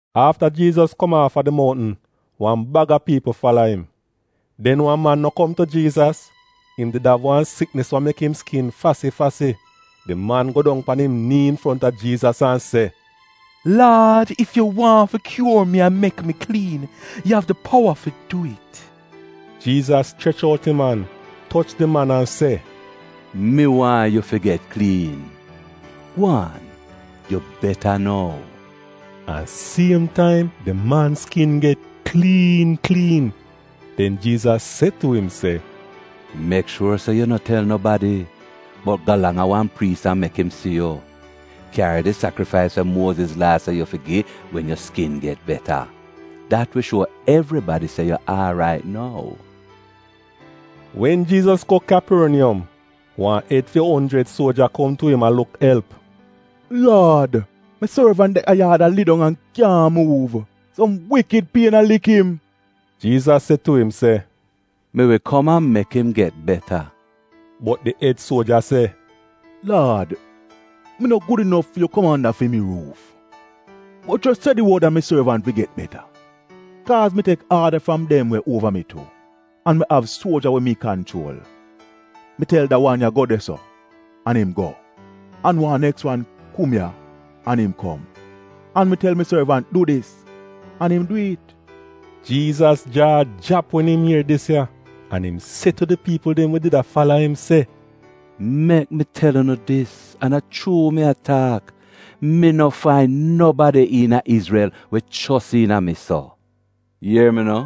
Afta Jiizas kom aafa di mountn, wan baga piipl fala im. Den wan man no kom tu Jiizas, im did av wan siknis we mek im skin fasi-fasi. Di man go dong pan im nii infronta Jiizas an se, “Laad ef yu waahn fi kyuor mi an mek mi kliin, yu av di powa fi dwi'it.” Jiizas chrech out im an, toch di man an se, “Mi waahn yu fi get kliin. Gwaan yu beta nou!” An siem taim di man skin get kliin kliin. Den Jiizas se tu im se, “Mek shuor se yu no tel nobadi, bot galang a wan priis an mek im si yu. Kyari di sakrifais we Muoziz Laa se yu fi gi wen yu skin get beta. Dat wi shuo evribadi se yu aarait nou.” Wen Jiizas go Kyaporniyom, wan ed fi onjrid suoja kom tu im a luk elp. “Laad, mi sorvant de a yaad a lidong an kyaahn muuv. Som wikid pien a lik im.” Jiizas se tu im se, “Mi wi kom an mek im get beta.” Bot di ed suoja se, “Laad, mi no gud inof fi yu kom anda fi mi ruuf, bot jos se di wod an mi sorvant wi get beta. Kaaz mi tek aada fram dem we uova mi tu, an mi av suoja we mi kanchuol. Mi tel da wan ya, ‘Go de-so’ an im go, an wan neks wan, ‘Kom ya’ an im kom. An mi tel mi sorvant, ‘Du dis’ an im dwi'it.” Jiizas jaa jrap wen im ier dis ya, an im se tu di piipl dem we did a fala im se, “Mek mi tel unu dis, an a chuu mi a taak, mi no fain nobadi iina Izrel we chos iina mi so! Ier mi no,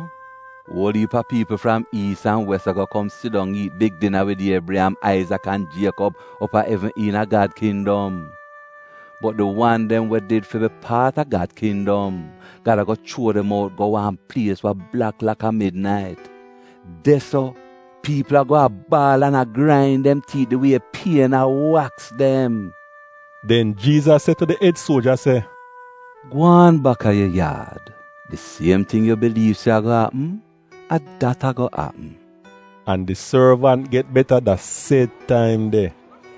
uol iip a piipl fram iis an wes ago kom sidong iit big dina wid Iebriyam, Aizak an Jiekob op a evn iina Gad kindom. Bot di wan dem we did fi bi paat a Gad kindom, Gad ago chuo dem out go wan plies we blak laka midnait. De-so, piipl ago a baal an a grain dem tiit di wie pien a waks dem.” Den Jiizas se tu di ed suoja se, “Gwaan bak a yu yaad, di siem ting yu biliiv se ago apm, a dat ago apm.” An di sorvant get beta da sed taim de.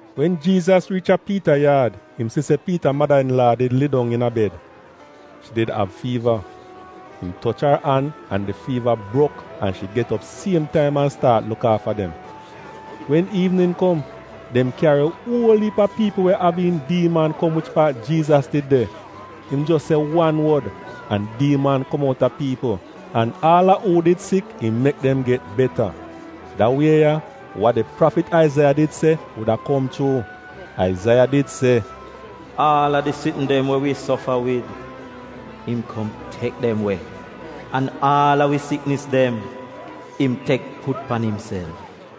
Wen Jiizas riich a Piita yaad, im si se Piita mada-in-laa did lie dong iina bed. Shi did av fiiva. Im toch ar an, an di fiiva brok, an shi get op siem taim an staat luk aafa dem. Wen iivnin kom, dem kyari uol iip a piipl we av iin diiman kom wich paat Jiizas did de. Im jos se wan wod an diiman kom outa piipl, an aal a uu did sik, im mek dem get beta. Da wie ya, wa di prafit Aizaiya did se, wuda kom chuu. Aizaiya did se: “Aal a di sitn dem we wi sofa wid, im kom tek dem we, an aal a wi siknis dem, im tek put pan imself.”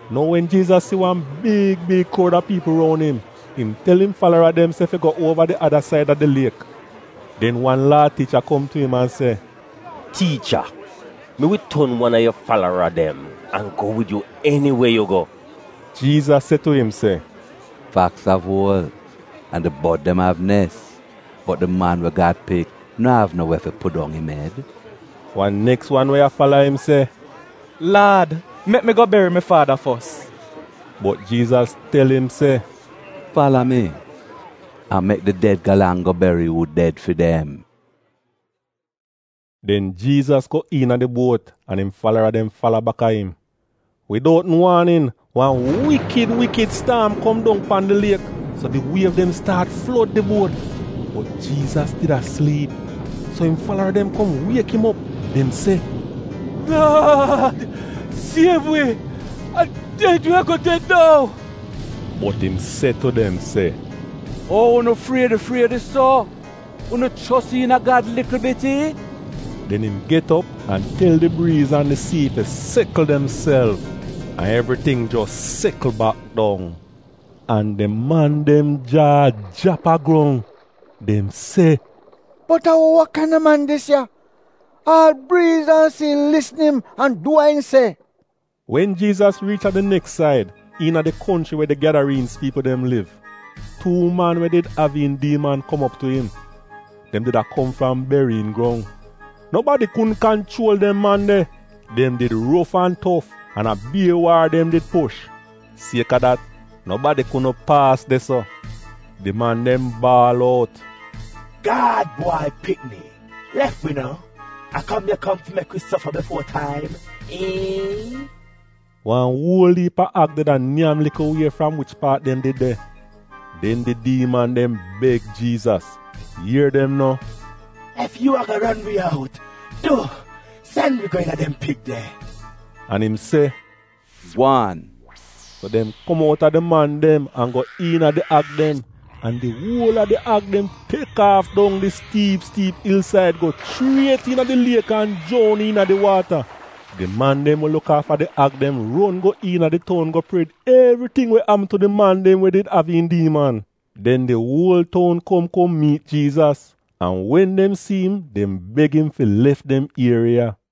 Nou wen Jiizas si wan big big kroud a piipl roun im, im tel im falara dem se fi go uova di ada said a di liek. Den wan Laa tiicha kom tu im an se, “Tiicha, mi wi ton wan a yu falara dem an go wid yu eniwe yu go.” Jiizas se tu im se, “Faks av uol, an di bod dem av nes, bot di Man we Gad Pik no av no we fi pudong im ed.” Wan neks wan we a fala im se, “Laad mek mi go beri mi faada fos.” Bot Jiizas tel im se, “Fala mi, an mek di ded galang go beri uu ded fi dem.” Den Jiizas go iina di buot an im falara dem fala baka im. Widoutn waanin wan wikid wikid staam kom dong pan di liek so di wiev dem staat flod di buot. Bot Jiizas did a sliip. So im falara dem kom wiek im op. Dem se, “Laad siev wi! A ded wi ago ded nou!” Bot im se tu dem se, “Ou unu friedi-friedi so? Unu chos iina Gad likl bit iihn?” Den im get op an tel di briiz an di sii fi sekl demself. An evriting jos sekl bak dong. An di man dem jaa jrap a grong, dem se, “Bot a wa kaina man dis ya? Aal briiz an sii lisn im an du wa im se!” Wen Jiizas riich a di neks said, iina di konchri we di Gyadariinz piipl dem liv, tuu man we did av iin diiman kom op tu im. Dem did a kom fram beriyin grong. Nobadi kudn kanchuol dem man de. Dem did rof an tof an a bier waar dem did push. Sieka dat, nobadi kudn paas de-so. Di man dem baal out, “Gad Bwai Pikni, lef wi no! A kom yu kom ya fi mek wi sofa bifuo taim, eh?” Wan uol iip a ag did a nyam likl wie fram wich paat dem did de. Den di diiman dem beg Jiizas, ier dem no, Ef yu ago ron wi out, du, sen wi go iina dem pig de.” An im se, “Gwaan!” So dem kom outa di man dem an go iina di ag dem, an di uol a di ag dem tek aaf dong di stiip stiip ilsaid go chriet iina di liek an joun iina di waata. Di man dem we luk aafa di ag dem ron go iina di toun go pred evriting we apm tu di man dem we did av iin diiman. Den di uol toun kom kom miit Jiizas, an wen dem si im dem beg im fi lef dem ieriya.